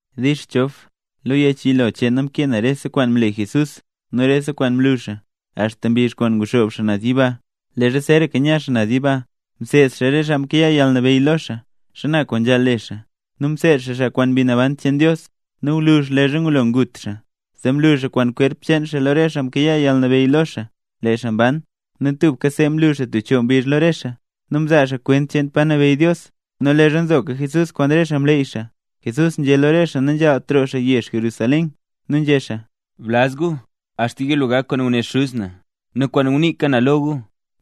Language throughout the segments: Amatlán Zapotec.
Dix Chof. Lo yech yilo cheen na mkee na rese kwaan mle Jesús nu rese kwaan mlu xaa, axta mbizh kwaan nguxoob xaa naz yiba. Leezha zeeraka nya xaa naz yiba, mseed xaa re xaa mkayaa yalnabeyy lo xaa, xana kwaan nzhaal le xaa, nu mseed xaa xaa kwaan Mbi Naban cheen Dios. Nu gwluzh leezha ngulo ngut xaa, zee mlu xaa kwaan kwerp cheen xaa lo re xaa mkayaa yalnabeyy lo xaa, lee xaa mban. Nu tubka see mlu xaa tub choo mbizh lo re xaa. Nu mzaa xaa kwent cheen pa nabeyy Dios. Nu leezha nzoka Jesús kwaan re xaa mleey xaa, Jesús nzhé lo re xaa nanzhaalt roo xaa yezh Jerusalén. Nu nzhé xaa: —Blaz gu axta yilo gak kwaan ngune Xuz na nu kwaan nguniika na lo gu.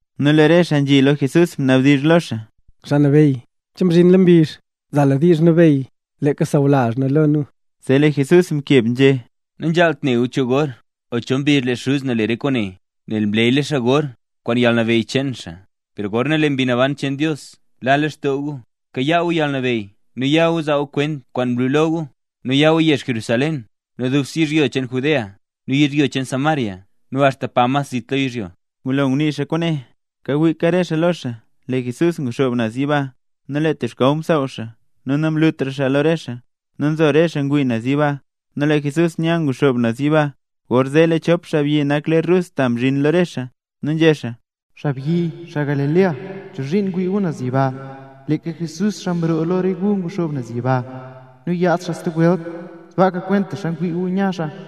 Nu lee re xaa nzhi lo Jesús, mnabdizh lo xaa: —Xaa Nabeyy, ¿che mzhinla mbizh, zaa lu diizh nabeyy leeka sawlazh nu lo nu? Zee lee Jesús mkeb nzhé: —Nanzhaalt ne gu cho gor o cho mbizh lee Xuz na le re kwaane, nel mleeyla xaa gor kwaan yalnabeyy cheen xaa. Per gorna lee Mbi Naban cheen Dios la leen lextoo gu, kayaa gu yalnabeyy nu ya gu zaa gu kwent kwaan mlu lo gu, nu ya gu yezh Jerusalén, nu dubse yizhyo cheen Judea nu yizhyo cheen Samaria nu axta pa mas zit lo yizhyo. Ngulo ngunii xaa kwaane, kawiika re xaa lo xaa, Jesús nguxoob naz yiba nu lee tub xkaw msaaw xaa, nu namlutra xaa lo re xaa. Nu nzo re xaa ngwii naz yiba, nu lee Jesús nya nguxoob naz yiba, gorzee lee chop xaabyi nak ler rus ta mzhin lo re xaa. Nu nzhé xaa: —Xaabyi, xaa Galilea, ¿chozhiin ngwii gu naz yiba? Leeka Jesús, xaa mroo lo re gu nguxoob naz yiba, nu yaad xaa stub welt, sbaaka kwentaxa ne gu nya xaa.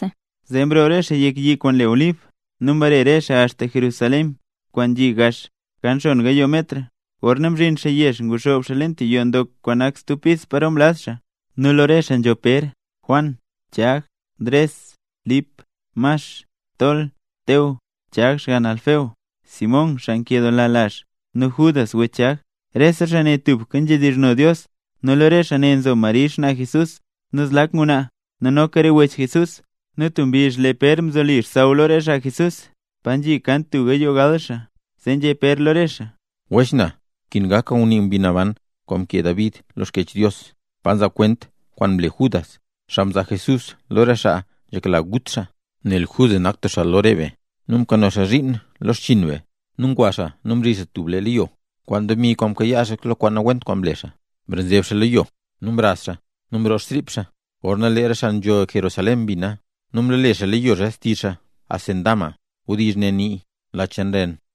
Zee mroo re xaa yek yi kwaan le Olib, nu mbare re xaa axta Jerusalén, kwaan nzhi gax, kan xon gayoo metr. Gorna mzhin xaa yezh, nguxoob xaa leen tub yoo ndok kwaan nak stub pis paro mlaz xaa. Nu lo re xaa nzho: Pér, Juan, Chag, Ndres, Lip, Max, Tol, Teo, Chag (xgann Alfeo), Simón (xaa nkedoola lazh), nu Judas (wech Chag). Rese xaa ne tubka nzhidizhno xaa Dios. Nu lo re xaa ne nzo Mari xnaa Jesús, nu zlak ngwnaa, nu noka re wech Jesús. Nu tub mbizh lee Pér mzoli xsaww lo re xaa Jesús, pa nzhi kan tub gayoo gal xaa, zee nzhé Pér lo re xaa: —Wech na, nkin gak kwaan ngunii Mbi Naban kwaan mkee David lo Xkyech Dios, pa nzaa kwent kwaan mle Judas, xaa mzaa Jesús lo re xaa nzhekla gut xaa. Nel Judas nak tub xaa lo re be, nu mkano xaa zhiin lo xchiin be, nu ngwa xaa nu mzi xaa tub leyo, kwaan demi kwaan mkayaa xaa lo kwaan nawent kwaan mle xaa. Mrenzeb xaa lo yo, nu mraz xaa, nu mroo xtrip xaa. Gorna lee re xaa nzho Jerusalén mbina, zee mlole xaa leyo zee xtizh xaa, “Acéldama”. (Wdizh ne nii: “Lach cheen ren”.)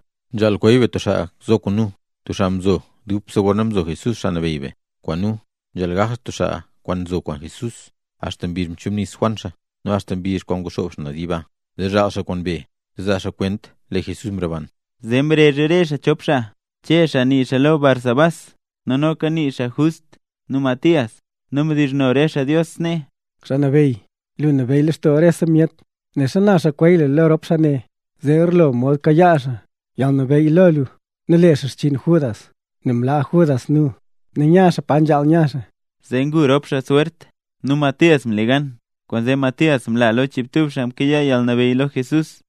Pér nzhé: —Nzhaal kweey be tub xaa zo kwaan nu, tub xaa kwaan mzo dubse leezha mzo Jesús Xaa Nabeyy be kwaan nu. Nzhaal gak xaa tub xaa mzo kwaan Jesús axta mbizh kwaan mchubnis Juan xaa, nu axta mbizh kwaan nguxoob xaa naz yiba, zee zhaal xaa kwaan be, zee zaa xaa kwent lee Jesús mroban. Zee mrezh re xaa chop xaa: Che (xaa nii xaa lo Barsabás nu noka nii xaa Just), nu Matías. Nu mdizhno re xaa Dios snee: —Xaa Nabeyy, lu nlabeyy lextoo rese myet. Né xana xaa kweey lu lo rop xaa ne, zee garlo mod kayaa xaa yalnabeyy lo lu nu le xaa xchiin Judas, nel mlaa Judas nu, nu nya xaa pa nzhaal nya xaa. Zee ngu rop xaa swert. Nu Matías mle gan, kwaanzee Matías mla lo chiibtub xaa mkayaa yalnabeyy lo Jesús.